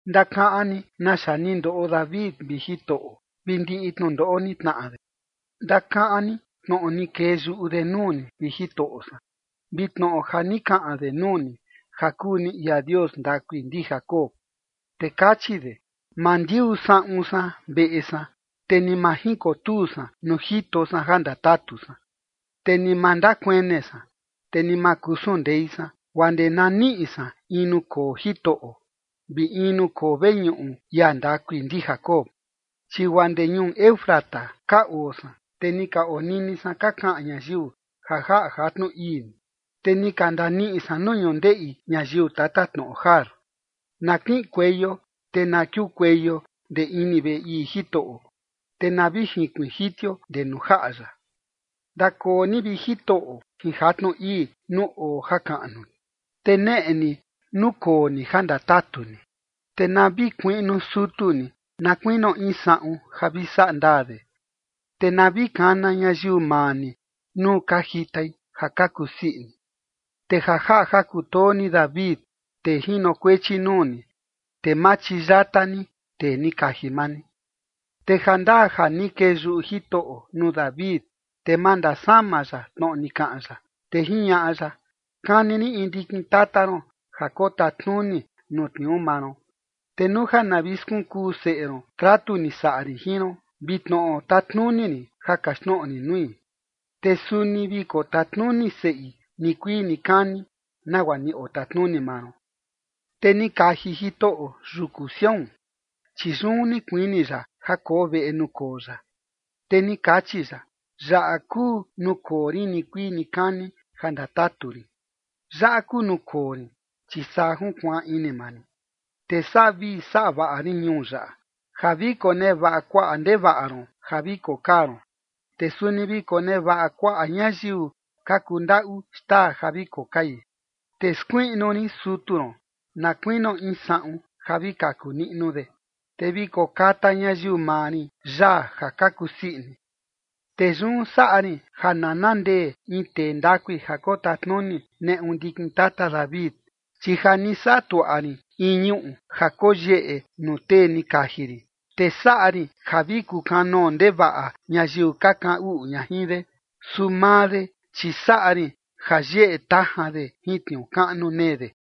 Ndakaꞌan ni naxa ni ndoꞌo David, vi Jitoꞌo, vi ndiꞌi tnundoꞌo ni tnaꞌa de. Ndakaꞌan ni tnoꞌo ni kee yuꞌu de nuu ni, vi Jitoꞌo san, vi tnoꞌo ja ni kaꞌan de nuu ni, ja kuu ni ia Dios ndakui ndi Jacob. Te kachi de: “Ma ndiuu saꞌun san veꞌe san, te ni ma jinkotuu san nuu jito san ja ndatatu san, te ni ma ndakuene san, te ni ma kusun ndei san, guaa ndee na niꞌi san in nuu koo Jitoꞌo, vi in nuu koo veñuꞌu ia ndakui ndi Jacob”. Chi guaa ndee ñuu Efrata ka oo san, te ni ka onini san ka kaꞌan ñayiu ja jaꞌa jatnu ii ni, te ni ka ndaniꞌi san nuu ñundeꞌi ñayiu tatatnoꞌo Jaar. Na kiꞌinkueio te na kiukueio ndee ini veꞌe ii Jitoꞌo, te na vi jinkuiin jitio ndee nuu jaꞌa ya. Ndakoo ni, vi Jitoꞌo, jin jatnu ii nuu oo jakaꞌnu ni, te neꞌe ni nuu koo ni ja ndatatu ni. Te na vi kuiꞌnu sutu ni na kuinio in saꞌun ja vi saꞌa ndaa de, Te na vi kana ñayiu maa ni nuu ka jitai ja ka kusii ini. Te ja jaꞌa ja kutoo ni David, tee jinokuechi nuu ni, te ma chiyata ni tee ni kaji maa ni. Te jandaa ja ni kee yuꞌu Jitoꞌo nuu David, te ma ndasama ya tnoꞌo ni kaꞌan ya, te jiñaꞌa ya: “Kani rin in ndikin tata ron ja kotatnuni nuu tniuu maa ron”. Te nuu ja na vi skunkuu seꞌe ron tratu ni saꞌa rin jin ron, vi tnoꞌo tatnuni rin ja kaxtnoꞌo rin nui, te suni vi kotatnuni seꞌi nikuii nikani, nagua ni otatnuni maa ron. Te ni kaji Jitoꞌo yuku Sión, chi yun ni kuini ya ja koo veꞌe nuu koo ya. Te ni kachi ya: Yaꞌa kuu nuu koo rin nikuii nikani ja ndatatu rin. Yaꞌa kuu nuu koo rin, chi saa junkuaan ini maa rin. Te saꞌa vii saꞌa vaꞌa rin ñuu yaꞌa, ja vi konevaꞌa kuaꞌa ndevaꞌa ron ja vi kokaa ron, te suni vi konevaꞌa kuaꞌa ñayiu ka kundaꞌu xtaa ja vi kokai. Te skuiꞌnu rin sutu ron na kuinio in saꞌun ja vi kaku niꞌnu de, te vi kokata ñayiu maa rin yaa ja ka kusii ini. Te yun saꞌa rin ja nana ndee in tee ndakui ja kotatnuni neꞌu ndikin tata David, chi ja ni saꞌa tuaꞌa rin in ñuꞌu ja koyeꞌe nuu tee ni kaji rin. Te saꞌa rin ja vi kukanoo ndevaꞌa ñayiu ka kaꞌan uꞌu ña jin de, su maa de, chi saꞌa rin ja yeꞌe tajan de jin tniuu kaꞌnu nee de.